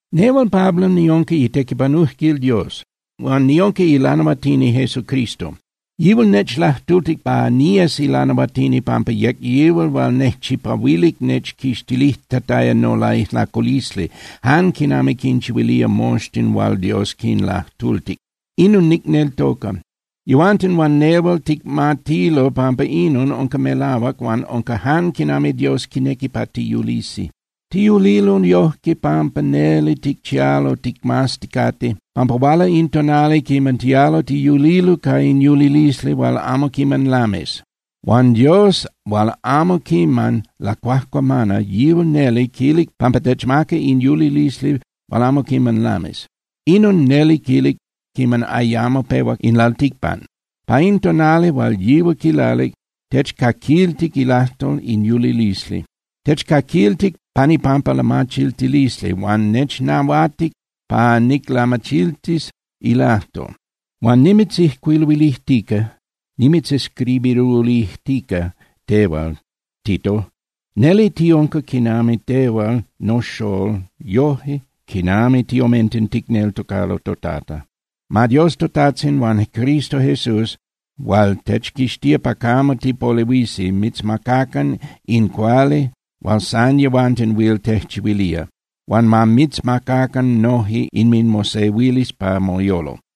Nehual Pablo niunca itequipanujquil Dios. Huan niunca ilanahuatini Jesucristo. Yihual nechlajtultic pa niyes ilanahuatini pampa yec yihual hual nejchipahuilic nechquixtilijtataya nolaijlaculisli, jan quinami quinchihuilía moxtin hual Dios quinlajtultic. Inon nicneltoca. Yehuanten huan nehual ticmatilo pampa inon unca melahuac huan unca jan quinami Dios quinequi pa tiyulisi. Tiyulilo yojque pampa neli ticchialo ticmazticate pampa huala in tonali quiman tialo tiyulilo ca in yulilisli hual amo quiman lamis. Huan Dios hual amo quiman lacuajcuamana, yihual neli quilic pampa techmaca in yulilisli hual amo quiman lamis. Inon neli quilic quiman ayamo pehuac in lalticpan. Pa in tonali hual yihual quilalic, techcaquiltic ilajtol in yulilisli. Techcaquiltic pan ipampa lamachiltilisli, huan nechnahuatic pa niclamachiltis ilajtol. Huan nimitzijcuiluilijtica (nimitzescribiruilijtica) tehual, Tito, neli unca quinami tehual noxolol yoje quinami tiomenten ticneltocalo toTata. Ma Dios toTajtzin huan Cristo Jesús hual techquixtía pa camo tipolehuisi mitzmacacan in cuali hual san yehuanten huil tejchihuilía. Huan ma mitzmacacan noje inminmosehuilisli pa moyolo.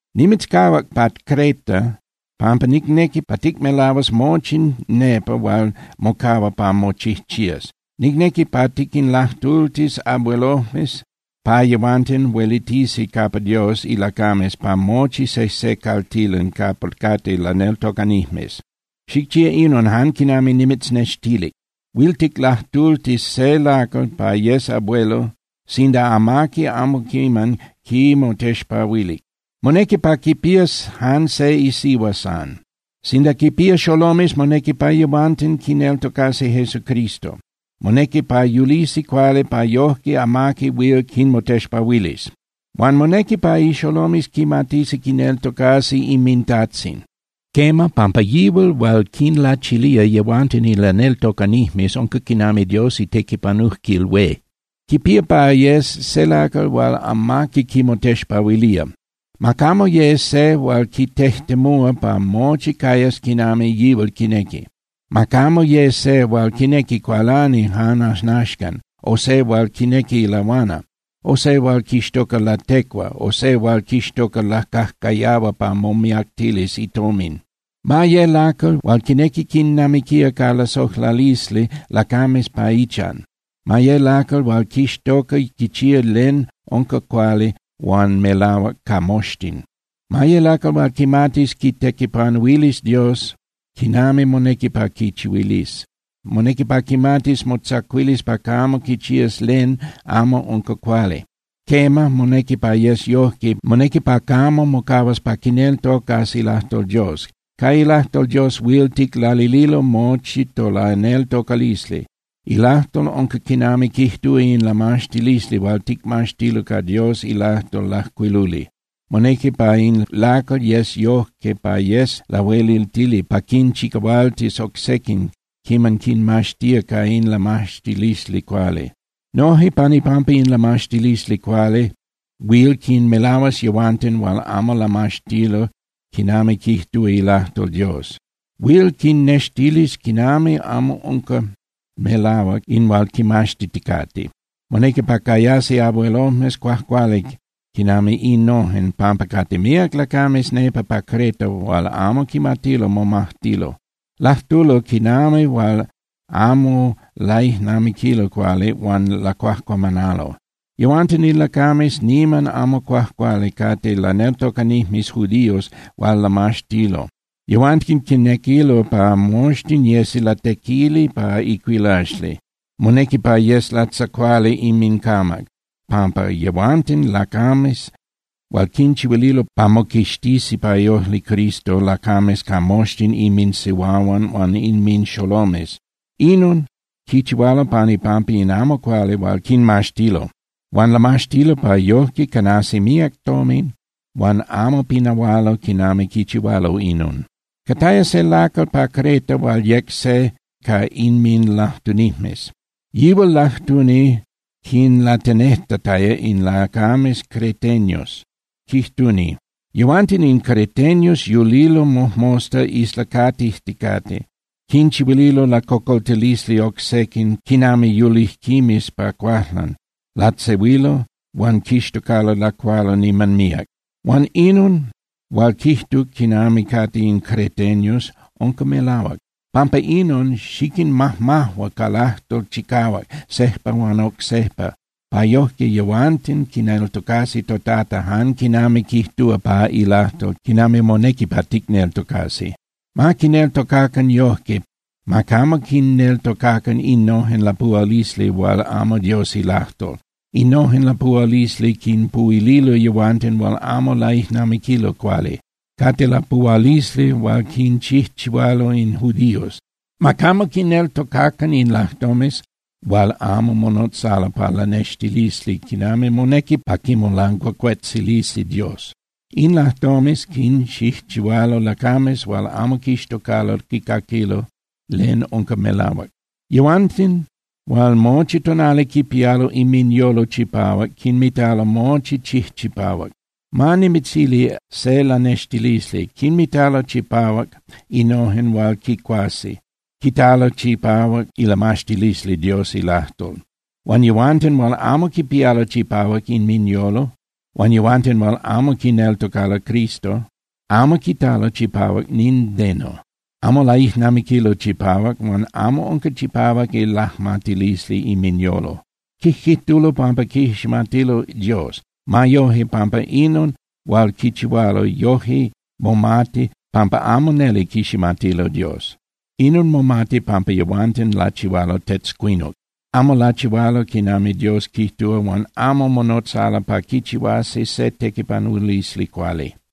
Nimitzcahuac pa Creta pampa nicnequi pa ticmelahuas mochi nepa hual mocahua pa mochijchías. Nicnequi pa tiquinlajtultis abuelojmes pa yehuanten huelitisi capa Dios ilacames pa mochi sejse caltilan capa cate laneltocanijmes. Xicchía inon jan quinami nimitznextilic. Huil ticlajtultis se lacal pa yes abuelo sinda amaqui amo quiman quimotexpahuilic. Monequi pa quipías jan se isihua san. Sinda quinpía xolomes, monequi pa yehuanten quineltocasi Jesucristo, monequi pa yulisi cuali pa yojque amaqui huil quinmotexpahuilis. Huan monequi pa ixolomes quimatisi quineltocasi inmintajtzin. Quema, pampa yihual hual quinlachilía yehuanten in laneltocanijmes unca quinami Dios itequipanujquil hué. Quipía pa yes se lacal hual amaqui quimotexpahuilía. Ma camo ye se hual quitejtemúa pa mochi cayas quinami yihual quinequi. Ma camo ye se hual quinequi cualani jan ajnaxcan, o se hual quinequi lahuana, o se hual quixtoca latecua, o se hual quixtoca lacajcayahua pa momiactilis itomin. Ma ye lacal hual quinequi quinnamiquía ca lasojlalisli lacames pa ichan. Ma ye lacal hual quixtoca quichía len unca cuali huan melahuac ca moxtin. Ma ye lacal hual quimatis quitequipanuilis Dios quinami monequi pa quichihuilis. Monequi pa quimatis motzacuilis pa camo quichías len amo unca cuali. Quema, monequi pa yes yojque, monequi pa camo mocahuas pa quineltocas ilajtol Dios. Ca ilajtol Dios huil ticlalililo mochi tolaneltocalisli. Ilajtol unca quinami quijtúa in lamaxtilisli hual ticmaxtilo ca Dios ilajtol lajcuiluli. Monequi pa in lacal yes yojque pa yes lahueliltili pa quinchicahualtis oc sequin quiman quinmaxtía ca in lamaxtilisli cuali. Noje pan ipampa in lamaxtilisli cuali, huil quinmelahuas yehuanten hual amo lamaxtilo quinami quijtúa ilajtol Dios. Huil quinnextilis quinami amo unca melahuac in hual quimaxtiticate. Monequi pa cayasi abuelojmes cuajcuali quinami innojen, pampa cate míac lacames nepa pa Creta hual amo quimatilo momajtilo. Lajtulo quinami hual amo laijnamiquilo cuali huan lacuajcuamanalo. Yehuanten in lacames niman amo cuajcuali cate laneltocanijmes judíos hual lamaxtilo. Yehuanten quinequilo pa moxtin yesi latequili pa icuilaxli. Monequi pa yes latzacuali inmincamac, pampa yehuanten lacames hual quinchihuililo pa moquixtisi pa iojli Cristo lacames ca moxtin inminsihuahuan huan inminxolomes. Inon quichihualo pan ipampa in amo cuali hual quinmaxtilo. Huan lamaxtilo pa yojque canasi míac tomin huan amo pinahualo quinami quichihualo inon. Cataya se lacal pa Creta hual yec se ca inminlajtunijmes, yihual lajtuni quinlatenejtataya in lacames creteños, quijtuni: “Yehuanten in creteños yulilo mojmosta islacatijticate, quinchihuililo lacocoltilisli oc sequin quinami yulijquimes pa cuajlan, latzehuilo huan quixtocalo lacualo niman míac.” Huan inon hual quijtuc quinami cate in creteños unca melahuac. Pampa inon, xiquinmajmajua ca lajtol chicahuac sejpa huan oc sejpa pa yoje yehuanten quineltocasi toTata jan quinami quijtúa pa ilajtol quinami monequi pa ticneltocasi. Ma quineltocacan yojque, ma camo quinneltocacan innojen lapuhualisli hual amo Dios ilajtol. Innojen lapuhualisli quinpuhuililo yehuanten hual amo laijnamiquilo cuali, cate lapuhualisli hual quinchijchihualo in judíos. Ma camo quinneltocacan in lajtomes hual amo monotzalo pa lanextilisi quinami monequi pa quimolancuacuetzilisi Dios. In lajtomes quinchijchihualo lacames hual amo quixtocalo quicaquilo len unca melahuac. Yehuanten hual mochi tonali quipialo inminyolo chipahuac quinmitalo mochi chijchipahuac. Ma nimitzili se lanextilisli: Quinmitalo chipahuac innojen hual quicuasi, quitalo chipahuac ilamaxtilisli Dios ilajtol. Huan yehuanten hual amo quipialo chipahuac inminyolo, huan yehuanten hual amo quineltocalo Cristo, amo quitalo chipahuac nindeno. Amo laijnamiquilo chipahuac huan amo unca chipahuac ilajmatilisli inminyolo. Quijquijtulo pampa quiximatilo Dios. Ma yoje, pampa inon hual quichihualo, yoje momati pampa amo neli quiximatilo Dios. Inon momati pampa yehuanten lachihualo tetzcuinuc. Amo lachihualo quinami Dios quijtúa huan amo monotzalo pa quichihuasi se tequipanulisli cuali.